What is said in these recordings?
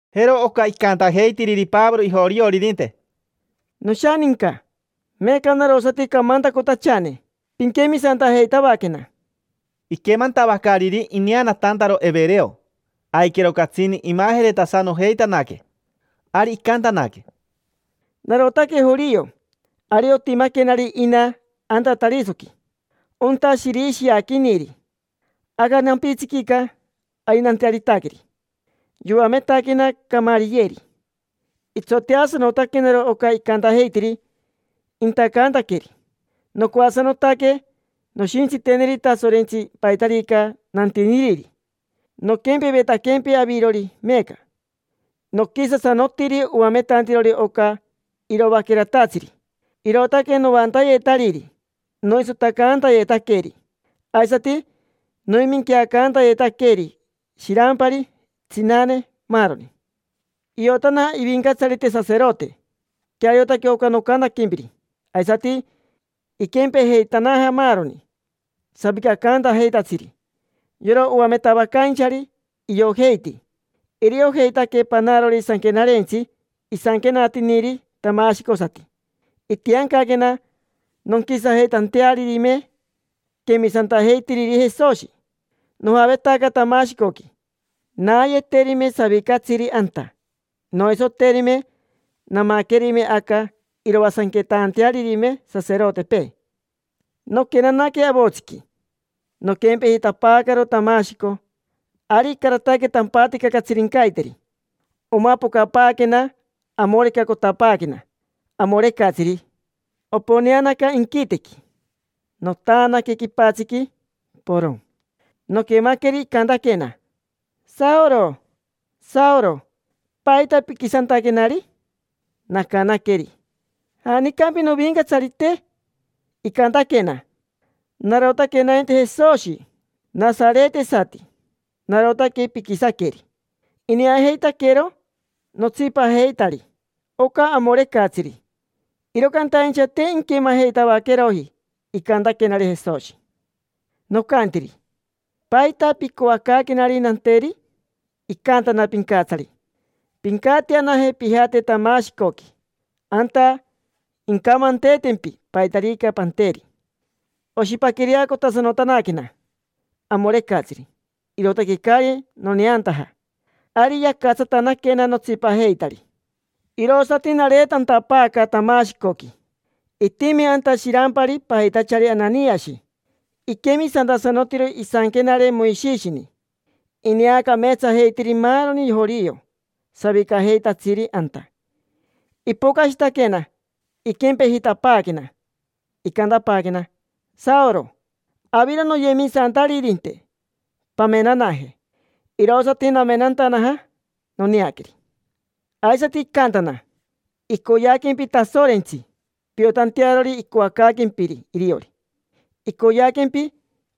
Jero oca icantajeitiriri Pavoro ijorioririnte: —Noshaninca. Meeca narosati camantacotachane. Pinquemisantajeitavaquena. Iquemantavacariri ineanatantaro evereo, aiquero catsini imajeretasanojeitanaque. Ari icantanaque: —Narotaque jorio. Ari otimaquenari ina anta Tarisoqui, onta shirishiaquiniri. Aca nampitsiquica ari nantearitaqueri. Yoametaquena Camariyeri, itsoteasanotaquenaro oca icantajeitiri intacantaqueeri. Nocoasanotaque noshintsiteneri Tasorentsi paitarica nantiniriri, noquempevetaquempi avirori meeca. Noquisasanotiri oametantirori oca iroaqueratatsiri, irootaque noantayetariri, noisotacantayetaqueri, aisati noiminqueacantayetaqueri shirampari, tsinane, maaroni. Iotana ivincatsarite saserote queariotaque oca nocantaquempiri. Aisati iquempejeitanaja maaroni savicacaantajeitatsiri: yora oametavacainchari, iojeiti. Iriojeitaque panarori sanquenarentsi isanquenatiniri tamashicosati. Itiancaquena nonquisajeitantearirime quemisantajeitiriri Jesoshi. Nojavetaca Tamashicoqui naayeterime savicatsiri anta, noisoterime. Namaquerime aca iroasanquetantearirime saserotepee. Noquenanaque avotsiqui, noquempejitapaacaro Tamashico. Ari icarataque tampatica catsirincaiteri. Omapocapaaquena, amorecacotapaaquena amorecatsiri, oponeanaca inquitequi. Notaanaque quipatsiqui, porocn. Noquemaqueri icantaquena: “Saoro. Saoro. ¿Paita piquisantaquenari?” Nacanaqueri: “¿Janicampi Novincatsarite?” Icantaquena: “Narotaque nainti Jesoshi, nasaretesati: narotaque piquisaqueri”. Ineajeitaquero notsipajeitari oca amorecatsiri, iro cantaincha te inquemajeitavaqueroji icantaquenari Jesoshi. Nocantiri: “¿Paita picoacaaquenari nanteri?” Icantana Pincatsari: “Pincatianaje, pijate Tamashicoqui. Anta incamanteetempi paitarica panteri”. Oshipaquireacotasanotanaquena amorecatsiri, irootaque caari noneantaja. Ari yacatsatanaquena notsipajeitari, irosati nareetapatapaaca Tamashicoqui. Itimi anta shirampari pajitachari Ananiashi. Iquemisantasanotiro isanquenare Moishishini. Ineacameetsajeitiri maaroni jorio, savicajeitatsiri anta. Ipocashitaquena, iquempejitapaaquena, icantapaaquena: “Saoro, aviro noyemisantaririnte. Pamenanaje”. Irosati namenantanaja, noneaqueri. Aisati icantana: “Icoyeaquempi Tasorentsi piotantearori icoacaaquempiri iriori. Icoyeaquempi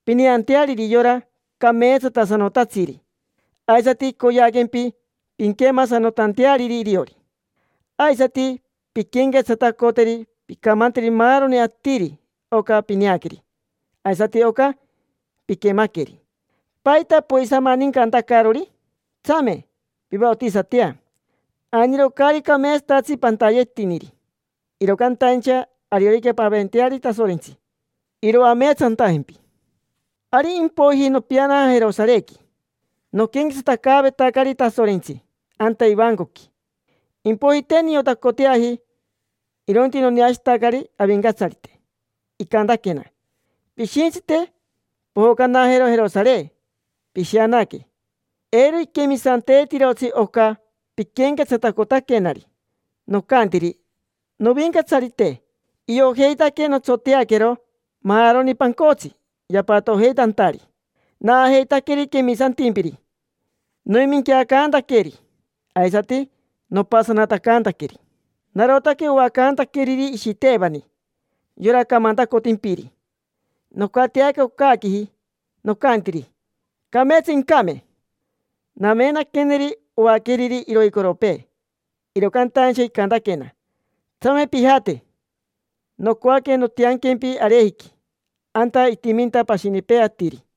pineanteariri yora Cameetsatasanotatsiri. Aisati icoyeaquempi pinquemasanotanteariri iriori. Aisati pinquenquetsatacoteri. Pincamanteri maaroni atiri oca pineaqueri aisati oca piquemaqueri. ¿Paita poisamanincantacarori? Tsame, pivaotisatea. Ainiro caari cameetsatatsi pantayetiniri, iro cantaincha ariorica paventeari Tasorentsi, iroameetsantajempi”. Ari impoiji nopianaja Jerosarequi. Noquenquetsatacaavetacari Tasorentsi anta ivancoqui, impoiji te niotacoteaji, irointi noneashitacari Avincatsarite. Icantaquena: “Pishintsite, pojocanajero Jerosare, pishianaque. Eiro iquemisanteetirotsi oca piquenquetsatacotaquenari”. Nocantiri: “Novincatsarite, iojeitaque notsoteaquero maaroni pancotsi yapatojeitantari, naajeitaqueri quemisantimpiri. Noiminqueacantaqueri, aisati nopasanatacantaqueri. Narotaque oacantaqueriri Ishitevani: yora camantacotimpiri. Nocatiaca ocaaquiji, nocantiri: ‘Cameetsa incame’. Namenaqueneri oaqueriri iroicoropee”. Iro cantaincha icantaquena: “Tsame pijate. Nocoaque nontianquempi arejiqui, anta itiminta pashinipee atiri”.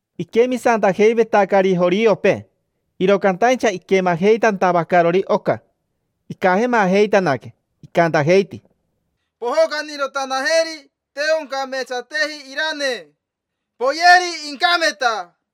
Iquemisantajeivetacari joriopee, iro cantaincha iquemajeitantavacarori oca, icajemajeitanaque. Icantajeiti: —Pojocanirotanajeri. Te oncameetsateji iranee: poyeri, incameta.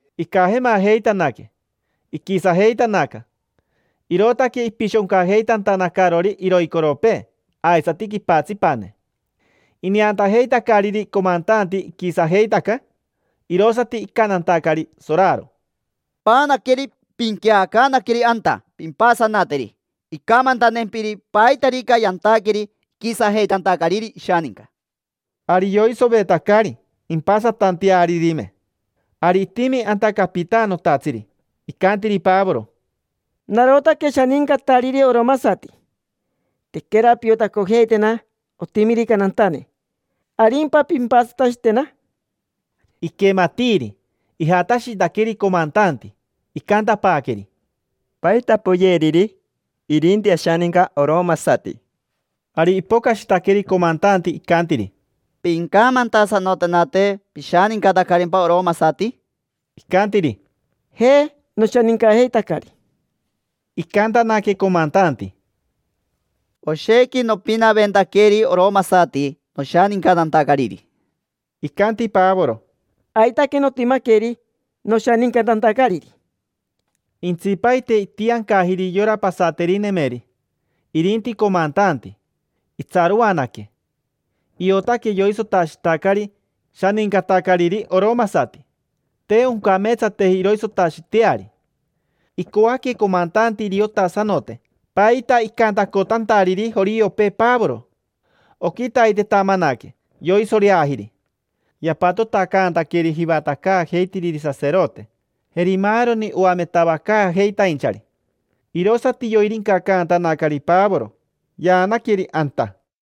Icajemajeitanaque, iquisajeitanaca, irootaque ipishoncajeitantanacarori iroicoropee aisati quipatsipane. Ineantajeitacariri comantanti iquisajeitaca, irosati icantantacari soraro: —Paanaqueri, pinqueacaanaqueri anta; pimpasanateri incamantantempiri paitarica yantaqueri iquisajeitantacariri ishaninca. Ari yoisovetacari impasatantearirime. Ari itimi anta capitanotatsiri, icantiri Pavoro: —Narotaque shanincatariri oromasati. Tequera piotacojeitena otimirica nantane, ¿arimpa pimpasatashitena? Iquematiiri, ijatashitaqueri comantanti. Icantapaaqueri: —¿Paita poyeriri? Irinti ashaninca arori. Ari ipocashitaqueri comantanti, icantiri: —Pincamantasanotenate. ¿Pishanincatarimpa oromasati? Icantiri: —Je, noshanincajeitacari. Icantanaque comantanti: —Oshequi nopinaventaqueri oromasati noshanincatantacariri. Icanti Pavoro: —Aitaque notimaqueri noshanincatantacariri. Intsipaite itiancajiri yora pasaterinemeri. Irinti comantanti, itsaroanaque. Iotaque yoisotashitacari shanincatacariri oromasati: te oncameetsateji iroisotashiteari. Icoaque comantanti iriotasanote paita icantacotantariri joriopee Pavoro. Oquitaitetamanaque yoisoreajiri. Yapatotacantaqueri jivatacaajeitiriri saserote, jeri maaroni oametavacaajeitainchari. Irosati yoirincacantanacari Pavoro, yaanaqueri anta.